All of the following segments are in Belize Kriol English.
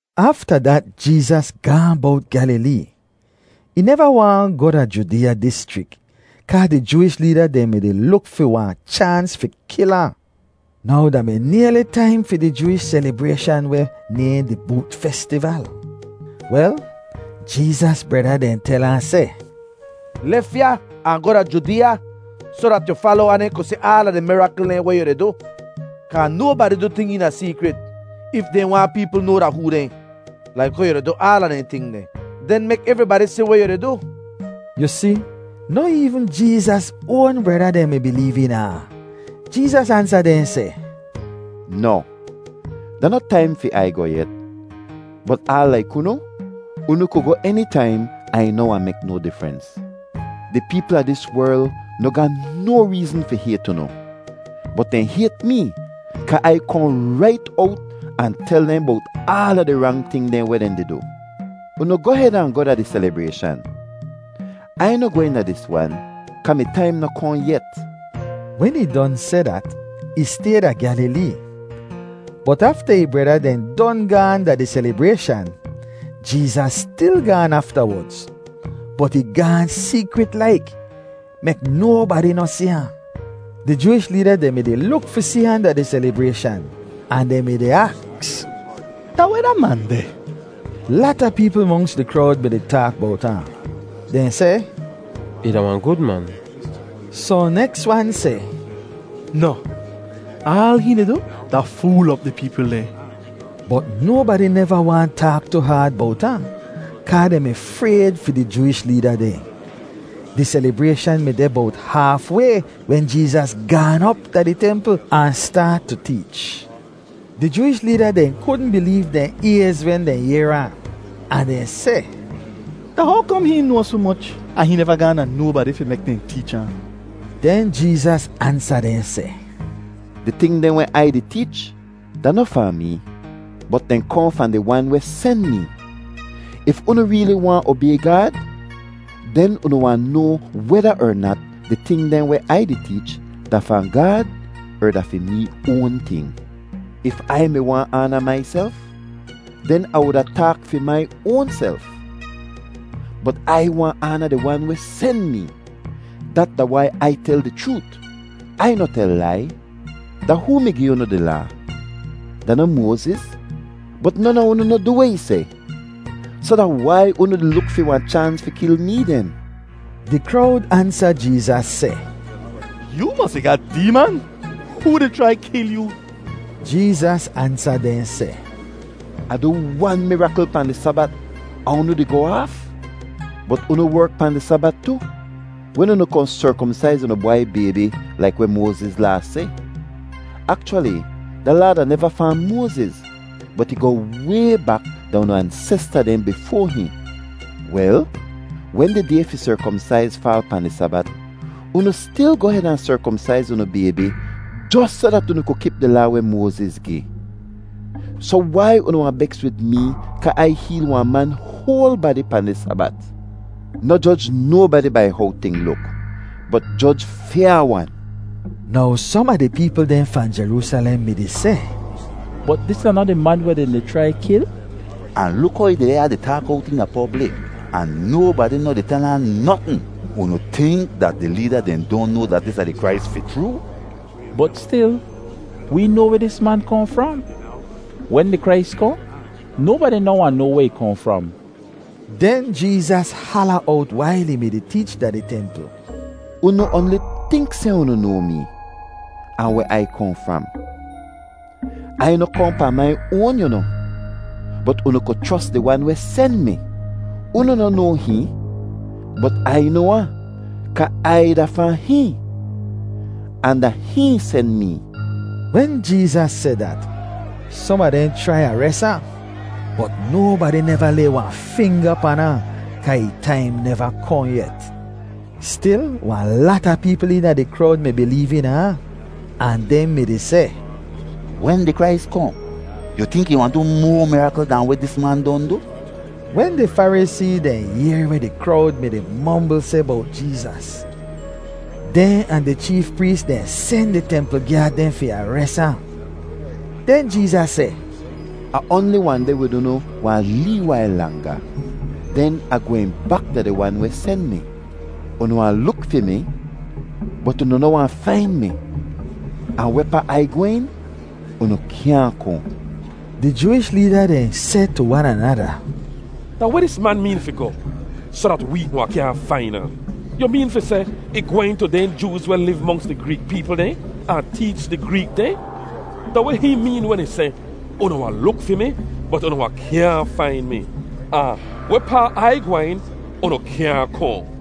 Afta dat Jeezas gaahn bowt Gyalilee. Ih neva waahn goh da Judeeya dischrik, kaa di Jooish leeda dehn mi-di luk fi wahn chaans fi kil ahn. Now da mi nayli taim fi di Jooish selibrayshan weh nayhn di Boot Festival. Wel, Jeezas breda dehn tel ahn seh, “Lef ya ahn goh da Judeeya, soh dat yu falowa dehn ku si aala di mirakl dehn weh yu di du; kaa nobadi du ting eena seekrit if dehn waahn peepl noa da hoo dehn. Laik how yu di du aala dehn ting deh, den mek evribadi si weh yu di du.” Yu si, noh eevn Jeezas oan breda dehn mi bileev eena ahn. Jeezas ansa dehn seh, “Noh, da noh taim fi Ai goh yet, bot aal laik unu, unu ku goh enitaim ahn ih noh wahn mek no difrens. Di peepl a dis werl noh ga no reezn fi hayt unu, bot dehn hayt mee kaa Ai kohn rait owt ahn tel dehn bowt aala di rang ting dehn weh dehn di du. Unu goh hed ahn goh da di selibrayshan. Ai noh gwehn da dis wan kaa mi taim noh kohn yet.” Wen ih don seh dat, ih stay da Gyalilee. Bot afta ih breda dehn don gaahn da di selibrayshan, Jeezas stil gaan aftawodz, bot ih gaahn seekrit laik, mek nobadi noh si ahn. Di Jooish leeda dehn mi-di luk fi si ahn da di selibrayshan ahn dehn mi-di aks, “Da weh da man deh?” Lata peepl monks di krowd mi-di taak bowt ahn. Dehn seh, “Ih da wahn gud man.” Sohn neks wan seh, “Noh, aal hihn di du da fool op di peepl dehn.” Bot nobadi neva waahn taak tu haad bowt ahn kaa dehn mi frayd fi di Jooish leeda dehn. Di selibrayshan mi deh bowt haaf way wen Jeezas gaan op da di templ ahn staat tu teech. Di Jooish leeda dehn kudn bileev dehn ayz wen dehn yehr ahn, ahn dehn seh, “Da how kom hihn noa soh moch ahn hihn neva gaahn da nobadi fi mek dehn teech ahn?” Den Jeezas ansa dehn seh, “Di ting dehn weh Ai di teech da noh fahn mee, bot dehn kohn fahn di Wan weh sen mee. If unu reeli waahn obay Gaad, den unu wahn noa weda er nat di ting dehn weh Ai di teech da fahn Gaad er da fi mee oan ting. If Ai mi waahn aana maiself, den Ah wuda taak fi mai oanself. Bot Ai waahn aana di Wan weh sen mee. Dat da wai Ai tel di chroot; Ai noh tel lai. Da hoo mi gi unu di Laa? Da noh Moaziz? Bot non a unu noh du weh ih seh. Soh da wai unu di luk fi wahn chaans fi kil mee den?” Di krowd ansa Jeezas seh, “Yoo mosi ga deeman! Hoo di chrai kil yoo?” Jeezas ansa dehn seh, “Ah du wan mirakl pahn di Sabat ahn unu di goh aaf! Bot unu werk pahn di Sabat tu wen unu kohn serkomsaiz unu bwai baybi laik weh Moaziz Laa seh. (Akchwali da laa da neva fahn Moaziz, bot ih goh way bak da unu ansesta dehn bifoa hihn.) Wel, wen di day fi serkomsaiz faal pahn di Sabat, unu stil goh hed ahn serkomsaiz unu baybi jos soh dat unu ku kip di Laa weh Moaziz gi. Soh wai unu wahn beks wid mee kaa Ai heel wahn man hoal badi pahn di Sabat? Noh joj nobadi bai how ting luk, bot joj fyaa-wan!” Now som a di peepl dehn fahn Jeroosalem mi-di seh, “Bot dis da noh di man weh dehn di chrai kil? Ahn luk how ih deh ya di taak owt eena poblik, ahn nobadi noh di tel ahn notn! Unu tink dat di leeda dehn don noa dat dis da di Krais fi chroo? Bot stil, wee noa weh dis man kohn fram; wen di Krais kohn, nobadi noh wahn noa weh ih kohn fram.” Den Jeezas hala owt wail ih mi-di teech da di templ, “Unu oanli tink seh unu noa mee, ahn weh Ai kohn fram. Ai noh kohn pahn mai oan, yu noh, bot unu ku chros di Wan weh sen mi. Unu noh noa hihn, bot Ai noa ahn, kaa Ai da fahn hihn, ahn da hihn sen mee.” Wen Jeezas seh dat, som a dehn chrai ares ahn, bot nobadi neva lay wahn finga pan ahn kaa ih taim neva kohn yet. Stil, wahn lata peepl eena di krowd mi bileev eena ahn, ahn dehn mi-di seh, “Wen di Krais kohn, yu tink ih wahn du moa mirakl dahn weh dis man don du?” Wen di Farisee dehn yehr weh di krowd mi-di mombl seh bowt Jeezas, dehn ahn di cheef prees dehn sen di templ gyaad dehn fi ares ahn. Den Jeezas seh, “Ah oanli wahn deh wid unu wahn lee wail langa, den Ah gwehn bak da di Wan weh sen mi. Unu wahn luk fi mi, bot unu noh wahn fain mi; ahn wehpaa Ai gwehn, unu kyaahn kohn.” Di Jooish leeda dehn seh tu wan anada, “Da weh dis man meen fi goh, soh dat wee wahn kyaahn fain ahn? Yu meen fi seh, ih gwehn tu dehn Jooz weh liv monks di Greek peepl dehn, ahn teech di Greek dehn? Da weh hihn meen wen ih seh, ‘Unu wahn luk fi mi, bot unu wahn kyaahn fain mi,’ ahn ‘Wehpaa Ai gwehn, unu kyaahn kohn’?”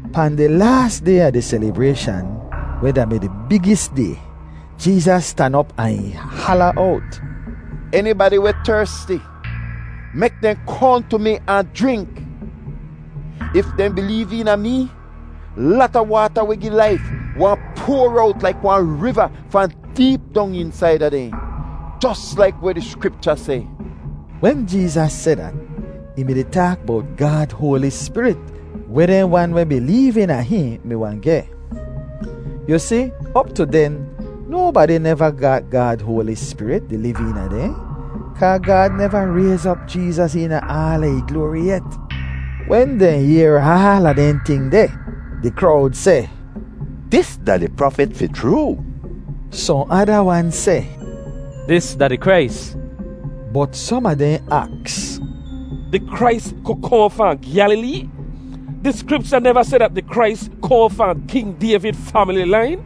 Pahn di laas day a di selibrayshan weh da-mi di bigis day, Jeezas stan op ahn ih hala owt, “Enibadi weh tersti, mek dehn kohn tu mi ahn jrink. If dehn bileev eena mee, lata waata weh gi laif wahn poar owt laik wahn riva fahn deep dong eensaida dehn, jos laik weh di Skripcha seh.” Wen Jeezas seh dat, ih mi-di taak bowt Gaad Hoali Spirit weh dehn wan weh bileev eena hihn mi wahn geh. Yu si, op tu den, nobadi neva ga Gaad Hoali Spirit di liv eena dehn, kaa Gaad neva rayz op Jeezas eena aala ih gloari yet. Wen dehn yehr aala dehn ting deh, di krowd seh, “Dis da di Prafit fi chroo.” Sohn ada wan seh, “Dis da di Krais.” Bot som a dehn aks, “Di Krais ku kohn fahn Gyalilee? Di Skripcha neva seh dat di Krais kohn fahn King Dayvid famili lain?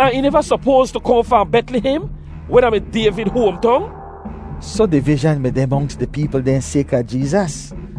Ahn ih neva sopoas tu kohn fahn Betlihem, weh da-mi Dayvid hoamtong?” Soh divizhan mi deh monks di peepl dehn sayka Jeezas.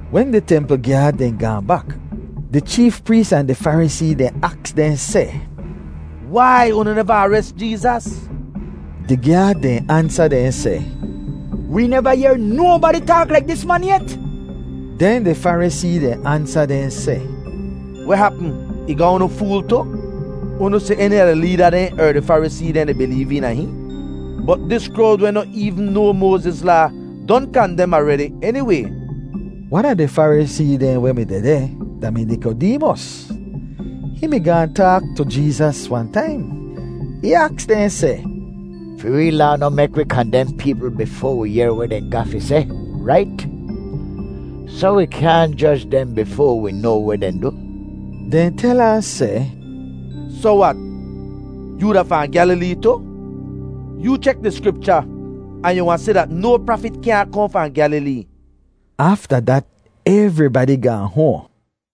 Wen di templ gyaad dehn gaahn bak, di cheef prees ahn di Farisee dehn aks dehn seh, “Wai unu neva ares Jeezas?” Di gyaad dehn ansa dehn seh, “Wee neva yehr nobadi taak laik dis man yet!” Den di Farisee dehn ansa dehn seh, “Weh hapm, ih ga unu fool tu? Unu si eni a di leeda dehn er di Farisee dehn di bileev eena hihn? Bot dis krowd weh noh eevn noa Moaziz Laa don kandem aredi eniway.” Wan a di Farisee dehn weh mi dehdeh da-mi Nikodeemos. Hihn mi gaahn taak tu Jeezas wahn taim. Ih aks dehn seh, “Fi wee Laa noh mek wi kandem peepl bifoa wi yehr weh dehn ga fi seh, rait? Soh wi kyaahn joj dehn bifoa wi noa weh dehn du.” Dehn tel ahn seh, “Soh wat, yoo da fahn Gyalilee tu? Yoo chek di Skripcha, ahn yu wahn si dat no prafit kyaahn kohn fahn Gyalilee.” [Afta dat evribadi gaahn hoahn.